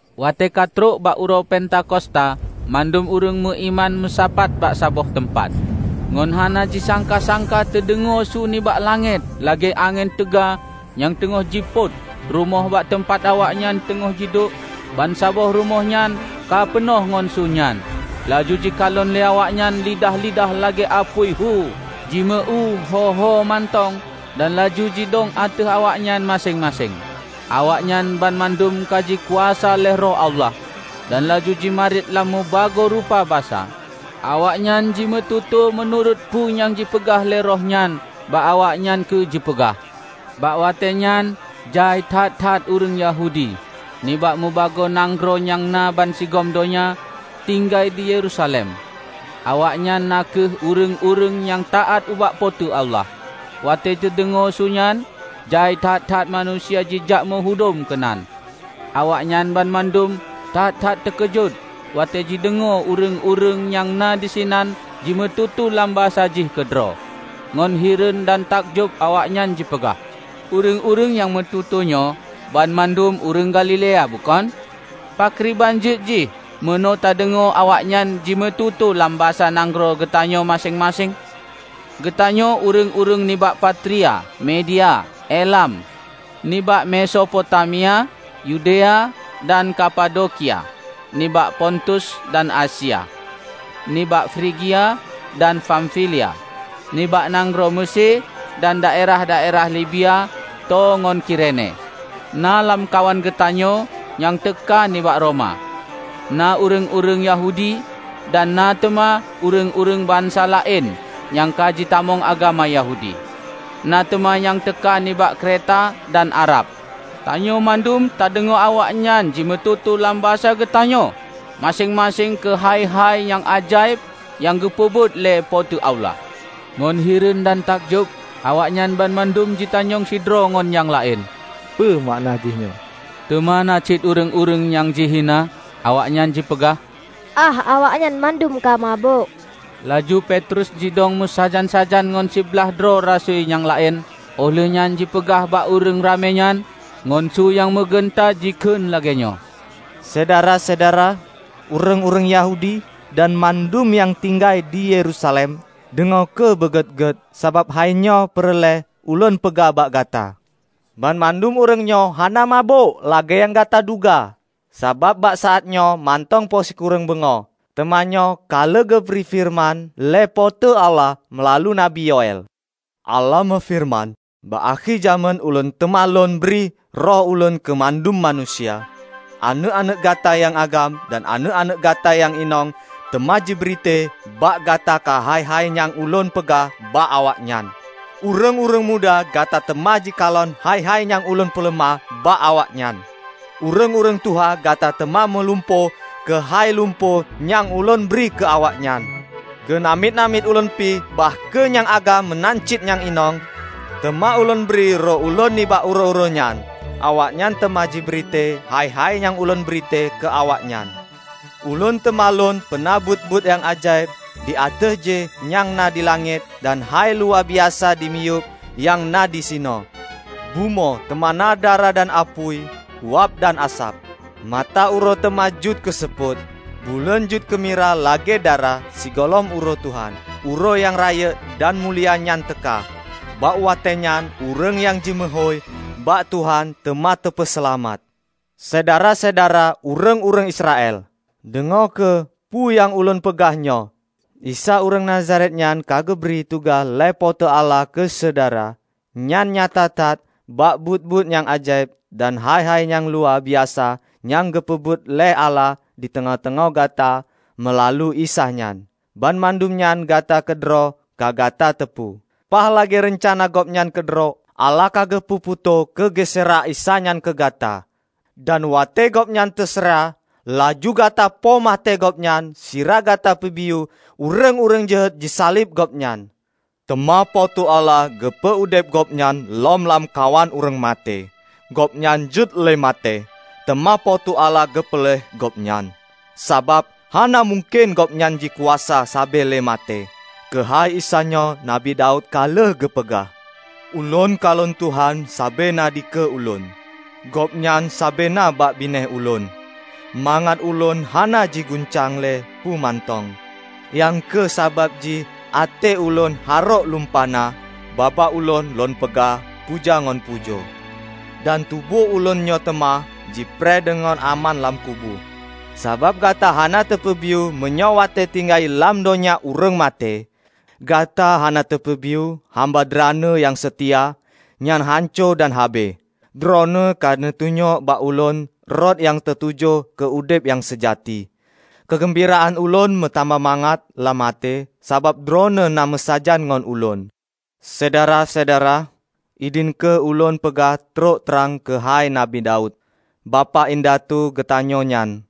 Watée ka trok bak uroe Pentakosta, mandum ureuëng meuiman meusapat bak saboh teumpat. Ngon hana jisangka-sangka teudeungoe su nibak langét lagée angén teuga nyang teungoh jipôt. Rumoh bak teumpat awaknyan teungoh jiduek bansaboh rumoh nyan ka peunoh ngon su nyan. Laju jikalon lé awaknyan lidah-lidah lagée apui hu jimeu-éue ho-homantong dan laju jidong ateueh awaknyan maséng-maséng. Awaknyan banmandum ka jikuasa lé Roh Allah, dan laju jimarit lam meubagoe rupa basa. Awaknyan jimeututoe meunurot peue nyang jipeugah lé Roh nyan bak awaknyan keu jipeugah. Bak watée nyan jai that-that ureuëng Yahudi, nibak mubagoe nanggroe nyang na bansigom donya, tinggai di Yerusalem. Awaknyan na kheueh ureuëng-ureuëng nyang taát ubak Po teu Allah. Watée teudeungoe su nyan, jai that-that manusia jijak meuhudom keunan. Awaknyan banmandum that-that teukeujot watée jideungoe ureuëng-ureuëng nyang na disinan jimututoe lam basa jih keudroe. Ngon hireuen dan takjob awaknyan jipeugah, "Ureuëng-ureuëng nyang meututoenyoe banmandum ureuëng Galilea bukon? Pakriban jeuet jih meunoe tadeungoe awaknyan jimeututoe lam basa nanggroe geutanyoe maséng-maséng? Geutanyoe ureuëng-ureuëng nibak Partia, Media, Elam; nibak Mesopotamia, Yudea dan Kapadokia; nibak Pontus dan Asia, nibak Frigia dan Famfilia, nibak nanggroe Meusé dan daerah-daerah Libiya tô ngon Kirene; na lamkawan geutanyoe nyang teuka nibak Roma, na ureuëng-ureuëng Yahudi dan na teuma ureuëng-ureuëng bansa laén nyang ka jitamong agama Yahudi; na teuma nyang teuka nibak Kreta dan Arab. Tanyoe mandum tadeungoe awaknyan jimeututoe lam basa geutanyoe maséng-maséng keuhai hai-hai nyang ajaéb nyang geupeubuet lé Po teu Allah!" Ngon hireuen dan takjob, awaknyan banmandum jitanyong sidroe ngon nyang laén, "Peue makna jih nyoe?" Teuma na cit ureuëng-ureuëng nyang jihina. Awaknyan jipeugah, "Ah, awaknyan mandum ka mabök!" Laju Petrus jidong meusajan-sajan ngon siblaih droe rasui nyang laén, óh lheuehnyan jipeugah bak ureuëng ramé nyan. Ngon su nyang meugeunta jikheun lagée nyoe, "Syedara-syedara, ureuëng-ureuëng Yahudi dan mandum nyang tinggai di Yerusalem! Deungoe kheueh beugét-gét, sabab hainyoe peureulée ulôn peugah bak gata. Banmandum ureuëng nyoe hana mabök, lagée nyang gata duga; sabab bak saát nyoe mantong poh sikureueng beungoh. Teuma nyoe ka lheueh geubri feureuman lé Po teu Allah meulalu Nabi Yoël: Allah meufeureuman, 'Bak akhé jamén Ulôn teuma Lôn bri Roh Ulôn keu mandum manusia. Aneuëk-aneuëk gata nyang agam dan aneuëk-aneuëk gata nyang inong teuma jibritée bak gata keuhai-hai nyang Ulôn peugah bak awaknyan. Ureuëng-ureuëng muda gata teuma jikalon hai-hai nyang Ulôn peuleumah bak awaknyan. Ureuëng-ureuëng tuha gata teuma mulumpo keuhai lumpo nyang Ulôn bri keu awaknyan. Keu namiet-namiet Ulôn pih -- bah kheueh nyang agam meunan cit nyang inong --, teuma Ulôn bri Roh Ulôn nibak uroe-uroe nyan. Awaknyan teuma jibri tée hai-hai nyang Ulôn bri tée keu awaknyan. Ulôn teuma Lôn peuna buet-buet nyang ajaéb di ateueh jéh nyang na di langét, dan hai-hai luwa biasa dimiyueb nyang na disinoe, bumoe; teuma na darah dan apui, uab dan asab. Mata uroe teuma jeuet keu seupôt, buleuen jeuet keumirah lagée darah Sigohlom Uroe Tuhan, Uroe nyang rayeuk dan mulia nyan teuka. Bak watée nyan, ureuëng nyang jimeuhôi bak Tuhan teuma teupeuseulamat.' Syedara-syedara ureuëng-ureuëng Israel! Deungoe kheueh peu nyang ulôn peugah nyoe; Isa ureuëng Nazaret nyan ka geubri tugaih lé Po teu Allah keu syedara. Nyan nyata that bak buet-buet nyang ajaéb dan hai-hai nyang luwa biasa nyang geupeubuet lé Allah di teungoh-teungoh gata meulalu Isa nyan. Banmandum nyan gata keudroe ka gata teupeue. Paih lagée reuncana Gobnyan keudroe, Allah ka geupeu putôh keu geuseurah Isa nyan keu gata. Dan watée Gobnyan teuseurah, laju gata poh maté Gobnyan sira gata peubiyeu ureuëng-ureuëng jeuhet jisaleb Gobnyan. Teuma Po teu Allah geupeu udeb Gobnyan lom lam kawan ureuëng maté. Gobnyan jiuét lé maté, teuma Po teu Allah geupeuleueh Gobnyan, sabab hana mungken Gobnyan jikuasa sabe lé maté. Keuhai Isa nyoe Nabi Daud ka lheueh geupeugah, 'Ulôn kalon Tuhan sabe na dikeue ulôn; Gobnyan sabe na bak binéh ulôn, mangat ulôn hana jiguncang lé peue mantong. Nyang kheueh sabab jih até ulôn harôk lumpah na, babah ulôn lôn peugah puja ngon pujoe; dan tuboh ulôn nyoe teuma jipreh deungon aman lam kubu. Sabab gata hana tapeubiyeu meunyoe watée teutinggai lam donya ureuëng maté. Gata hana tapeubiyeu hamba Droeneueh nyang seutia nyan hanco dan habéh. Droeneueh ka neutunyok bak ulôn rot nyang teutuju keu udeb nyang seujati. Keugeumbiraan ulôn meutamah mangat lam até sabab Droeneueh na meusajan ngon ulôn.' Syedara-syedara, idhin kheueh ulôn peugah trok trang keuhai Nabi Daud, bapak indatu geutanyoe nyan.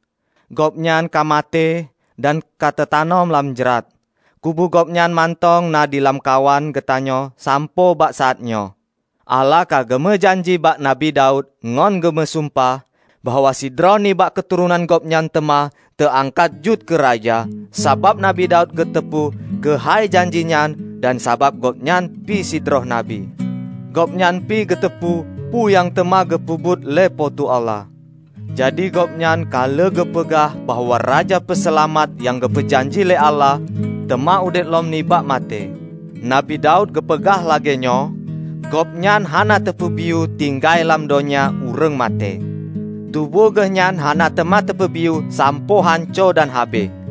Gobnyan ka maté dan ka teutanom lam jrat; kubu gobnyan mantong na di lamkawan geutanyoe sampoe bak saát nyoe. Allah ka geumeujanji bak Nabi Daud, ngon geumeusumpah, bahwa sidroe nibak keuturonan gobnyan teuma teu angkat jeuet keu raja. Sabab Nabi Daud geuteupeue keuhai janji nyan dan sabab gobnyan pih sidroe Nabi, gobnyan pih geuteupeue peue nyang teuma geupeubuet lé Po teu Allah. Jadi gobnyan ka lheueh geupeugah bahwa Raja Peuseulamat nyang geupeu janji lé Allah, teuma udeb lom nibak maté. Nabi Daud geupeugah lagée nyoe, 'Gobnyan hana teupeubiyeu tinggai lam donya ureuëng maté; tuboh Geuh nyan hana teuma teupeubiyeu sampoe hanco dan habéh.'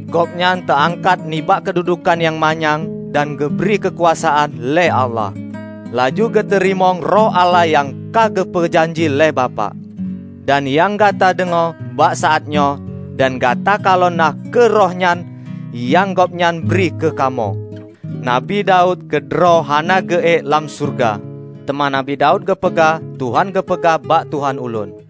Gobnyan teuangkat nibak keududuekan nyang manyang dan geubri keukuasaan lé Allah, laju geuteurimong Roh Allah nyang ka geupeu janji lé Bapak. Dan nyang gata deungoe bak saátnyoe dan gata kalon na kheueh Roh nyan nyang Gobnyan bri keu kamoe. Nabi Daud keudroe hana geu-ék lam syeuruga, teuma Nabi Daud geupeugah, 'Tuhan geupeugah bak Tuhan ulôn: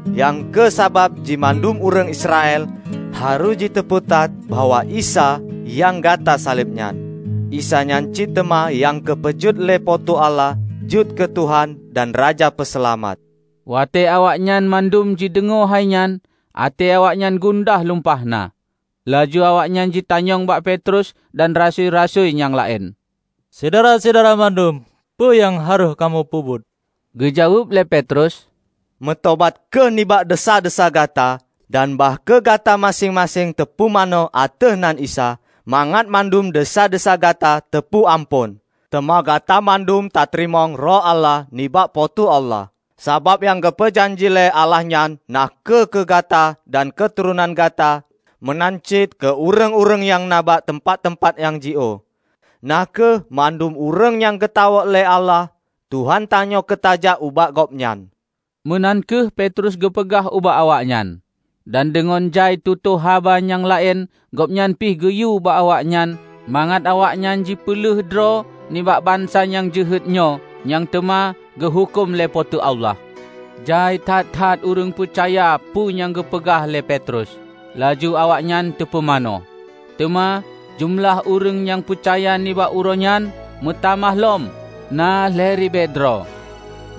Nyang kheueh sabab jih mandum ureuëng Israel harôh jiteupeue that bahwa Isa nyang gata saleb nyan, Isa nyan cit teuma nyang ka geupeujeuet lé Po teu Allah jeuet keu Tuhan dan Raja Peuseulamat!" Watée awaknyan mandum jideungoe hai nyan, até awaknyan gundah lumpah na. Laju awaknyan jitanyong bak Petrus dan rasui-rasui nyang laén, "Syedara-syedara mandum, peue nyang harôh kamoe peubuet?" Geujaweueb lé Petrus, "Meutobat kheueh nibak desya-desya gata. Dan bah kheueh gata maséng-maséng teupumanö ateueh nan Isa, mangat mandum desya-desya gata teupeue amphon. Teuma gata mandum tateurimong Roh Allah nibak Po teu Allah. Sabab nyang geupeu janji lé Allah nyan na kheueh keu gata dan keuturonan gata meunan cit keu ureuëng-ureuëng nyang na bak teumpat-teumpat nyang jiôh -- na kheueh mandum ureuëng nyang geutawök lé Allah Tuhan tanyoe keu tajak ubak Gobnyan." Meunan kheueh Petrus geupeugah ubak awaknyan. Dan deungon jai tutoe haba nyang laén gobnyan pih geuyue bak awaknyan mangat awaknyan jipeuleueh droe nibak bansa nyang jeuhet nyoe nyang teuma geuhuköm lé Po teu Allah. Jai that-that ureuëng peucaya peue nyang geupeugah lé Petrus, laju awaknyan teupumanö. Teuma jeumeulah ureuëng nyang peucaya nibak uroe nyan meutamah lom na lhée ribée droe.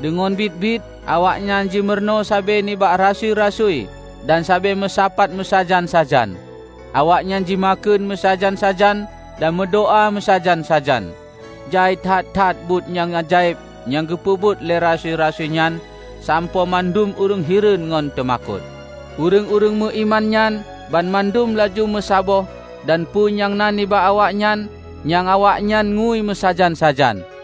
Deungon biet-biet awaknyan jimurunoe sabe nibak rasui-rasui dan sabe meusapat meusajan-sajan. Awaknyan jimakheun meusajan-sajan dan meudoá meusajan-sajan. Jai that-that buet nyang ajaéb nyang geupeubuet lé rasui-rasui nyan sampoe mandum ureuëng hireuen ngon teumakot. Ureuëng-ureuëng meuiman nyan banmandum laju meusaboh dan peue nyang na nibak awaknyan, nyang awaknyan ngui meusajan-sajan.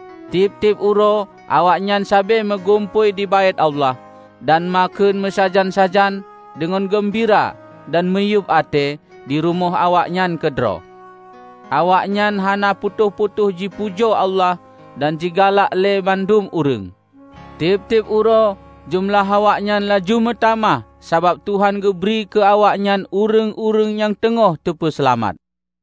Tieb-tieb uroe awaknyan sabe meugumpôi di Baét Allah; dan makheun meusajan-sajan, deungon geumbira dan miyueb até di rumoh awaknyan keudroe. Awaknyan hana putôh-putôh jipujoe Allah dan jigalak lé mandum ureuëng. Tieb-tieb uroe jeumeulah awaknyan laju meutamah sabab Tuhan geubri keu awaknyan ureuëng-ureuëng nyang teungoh teupeuseulamat.